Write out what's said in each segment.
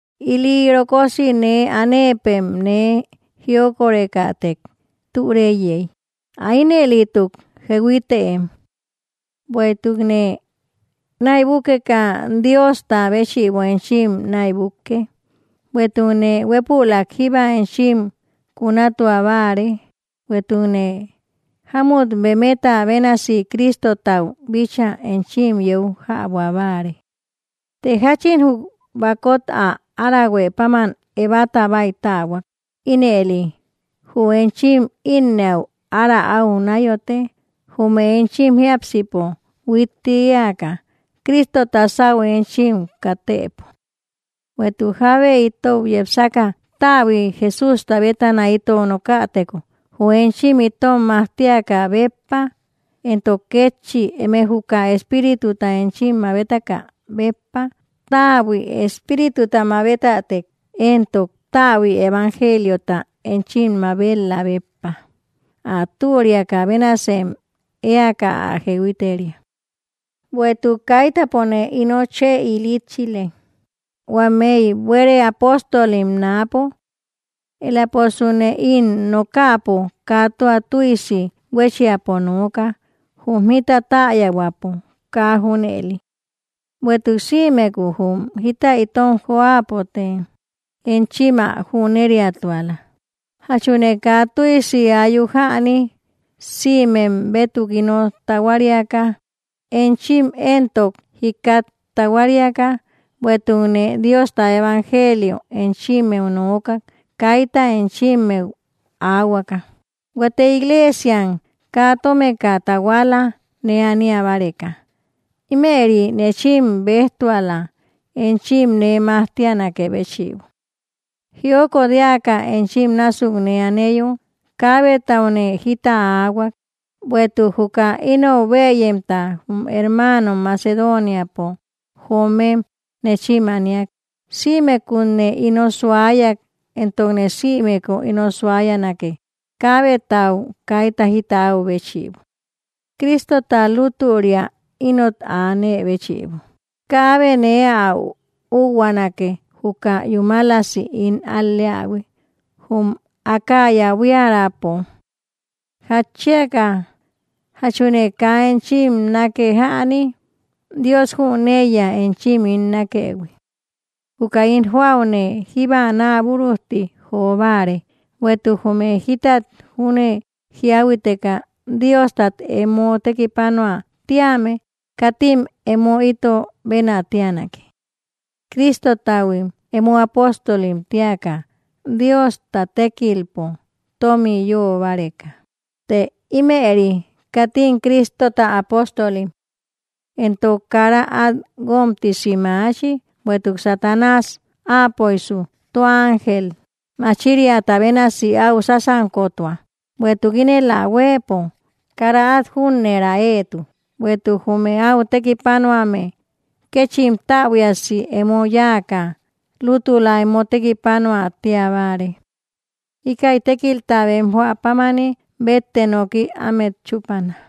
Ili rokosi nee anëpem nee jiokorekätek türeíyey, ä ínëlituk jehuitëem. Bueïtukne näibukeka, Diosta béchïbo enchim näibukke, bueïtukne huépülak jíba enchim kunatua báare, bueïtukne jamut bemeta bénasi Cristotau bíchaa enchim yeu jäbua báare. Të jachin jü bakot ä arahuë páman Evata báitähuak, ínëli jü enchim innëau ára au nayote, jum enchim jiápsipo huitti eäka Cristota sáu enchim katëpo. Bueïtuk jábe itou yepsaka täbui Jesústa bétana itou nokäteko, jü enchim itom majtiakä béppa, entok kétchi eme juka espírituta enchim mabetakä béppa täbui espírituta mabetätek, entok täbui evangeliota enchim mabet‑lä béppa, ä turiakä bénasem eäka ä jehuiteria. Bueïtuk kaitäpone ino chë ilitchile, huameï buere apóstolim náapo. Eläposune ín nokäpo, kaa tua tüisi huéchiapo nooka, jum jita täyahuäpo kaa junëli; bueïtuk sïmeku jum jita itom joäpote enchim ä jüneriatuala. ¿Jachune kaa tüisi ayuk jäni sïmem bétuk ino tahuariaka, enchim éntok jikat tahuariaka, bueïtukne Diosta evangelio enchimmeu nookak kayta enchimmeu aahuaka? Huate iglesiam kaa tómeka tahuala nee ania báreka, ímëri nechim bejtuala enchim nee majtianakë béchïbo. Jiokot eäka enchim násuk nee aneyo, kaabetaune jita áahuak, bueïtuk juka inou bëyemta, jume hermanom Macedoniapo joomem nechim aniak, sïmekutne ino suayak, entokne sïmeku ino suayanake, kaabetau kayta jita au béchïbo. Cristota lutüria inot anë béchïbo, kaabe nee ä úkhuanake juka yúmalasi ín al‑leähui jum Acaya buiärapo. ¿Jatchiaka? ¿Jachune kaa enchim nake, jäni? Dios jüneiya enchim ín nakëhui. Juka ín joaüne jíba naburujti jobare, bueïtuk jume jítat júne jiahuiteka Diostat emo tekipanuä tíame, katim emo ito benä tianake. Cristotahuim emo apóstolim tiaka, Diosta tekilpom tomi yö báreka, të ímëri katim Cristota apóstolim. Entok kara at guomtisi maachi, bueïtuk Satanás apöisu tua ángel machiriata bénasi áu sasankotua. Bueïtuk ínel ä huëpo kara át jünnera eetu bueïtuk jume au tekipanuame kechim täbuiasi emo yáaka, lútüla emo tekipanuä tiabare; íkäi tékilta bem joä pámani bette nooki ámet chupana.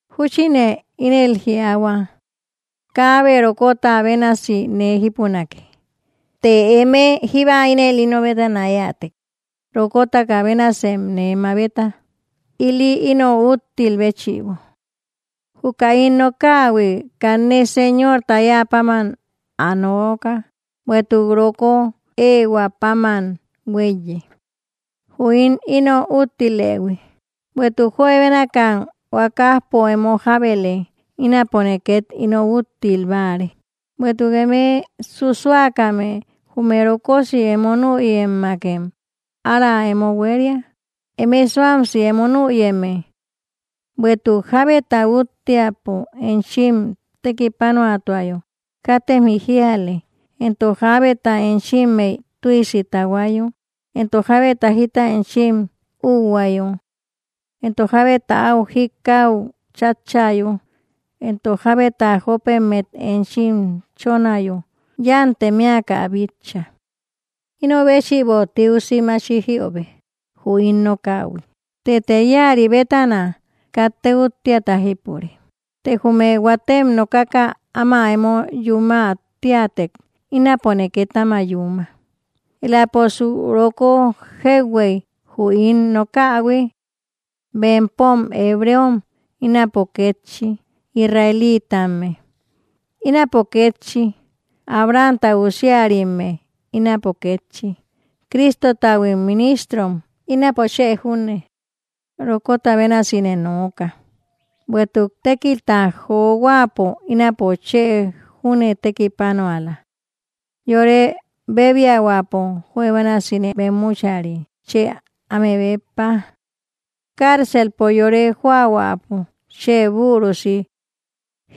Júchine ínel jiaahua: káabe rokota bénasi nee jípunake; të emëe jíba ínëli ino bétana eätek, rokota bénasem nee mabeta, ili ino úttil béchïbo. Juka ín nokähui, kanne Señorta eäpáman ä nooka, bueïtuk roko ehuäpáman hueíye. Jü ín ino úttilëhui. Bueïtuk juebénakam huakajpo emo jábele, ínapone ket ino úttil báare. Bueïtuk eme susuakame jume rokosí emo nüyemmakem ára emo hueria, emëe suamsi emo nüyeme. Bueïtuk jábeta úttiapo enchim tekipanuatuayo katem jijiale, entok jábeta enchimmey tüisi tahuayo, entok jábeta jita enchim: üuhuayo, entok jábeta au jikau chatchayo, entok jábeta jopemmet enchim chonayo, yantem eäka ä bitcha. Inobéchïbo tiusi maachi jiöbe jü ín nokähui, tëte iäri bétana katte úttiata jípure. Të jume huatem nokaka áma emo yumä teätek, ínapone ket áma yúma eläposu roko jeuhuey jü ín nokähui. ¿Bempom hebreom? Ínapo kétchi, ¿israelitamme? Ínapo kétchi. ¿Abramta usiarimme? Ínapo kétchi. ¿Cristotahuim ministrom? Ínapo chë junne (rokota bénasi nee nooka); bueïtuk tékilta johuäpo, ínapo chë júne tekipanuala; yore bebiahuäpo juebénasine bemmuchari chë áme béppa; carcelpo yore joahuäpo chë burusi;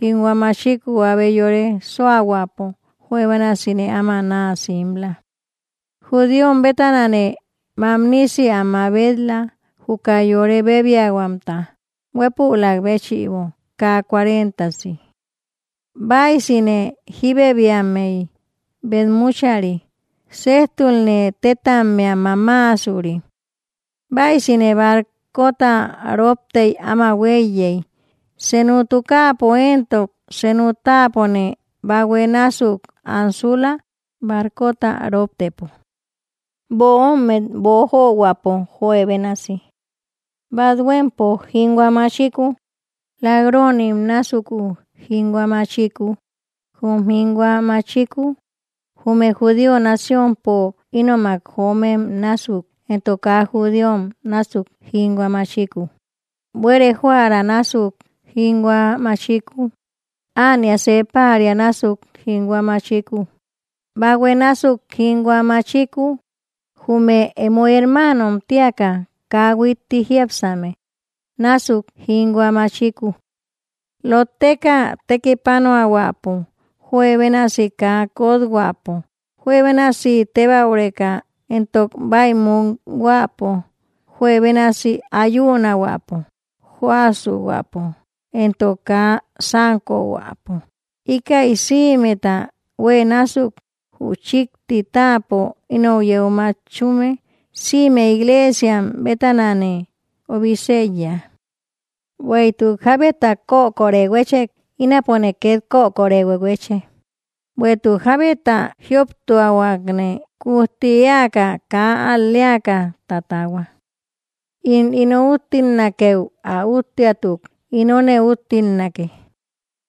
jinhua machiku abe yore suahuäpo juebénasine áma naa simla. Judíom bétanane mamnisi ä mabet‑la juka yore bebiahuamta, huépülak béchïbo kaa cuarentasi. Baysine jibebiammey betmuchari, sejtulne tetammea mamaasuri. Baysine barcota roptey áma hueiyey, senu tukaapo entok senu taapone bahue násuk ansula barcota roptëpo. Böommet boojohuäpo juebénasi; bathuempo jinhua machiku, lak-ronim násuku jinhua machiku, jum jinhua machiku jume judío naciompo ínomak joomem násuk, entok kaa judíom násuk jinhua machiku, buere joära násuk jinhua machiku, ánia see paria násuk jinhua machiku, bahue násuk jinhua machiku, jume emo hermanom tiaka kaa huitti jiápsame násuk jinhua machiku. Lotteka tekipanuahuäpo, juebénasi kaa kothuäpo, juebénasi tebaureka, entok baïmukhuäpo, juebénasi ayunahuäpo, joäsuhuäpo entok kaa sankohuäpo. Ikäi sïmeta hue násuk, jü chikti táapo ínou yeu matchume, sïme iglesiam bétanane obiseíya. ¿Bueïtuk jábeta koköri huechek, ínapone ket koköri huehueche? Bueïtuk jábeta jïoptuahuakne, kujti eäka kaa al‑leaka tatahua. In ino úttilnakeu ä úttiatuk, inone úttilnake,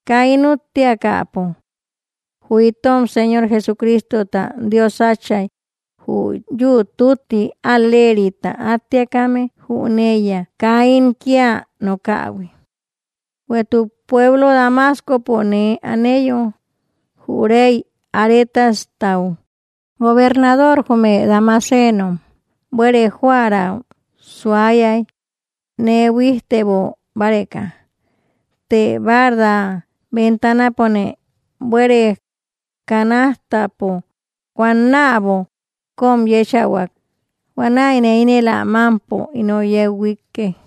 kaa ín úttiakäpo. Jü itom Señor Jesucristota Dios Atchay, jü yü‑tütti al‑lerita attiakame, jüneiya kaa ín kia nokähui. Bueïtuk pueblo Damascopo nee aneyo, jü rey Aretastau gobernador jume damasenom buere joära suayay, nee buijtebo báreka. Të barda bentanapone buere kanajtapo huannäbo kom yéchahuak, huanäine ínël ä mampo ino yeu huikek.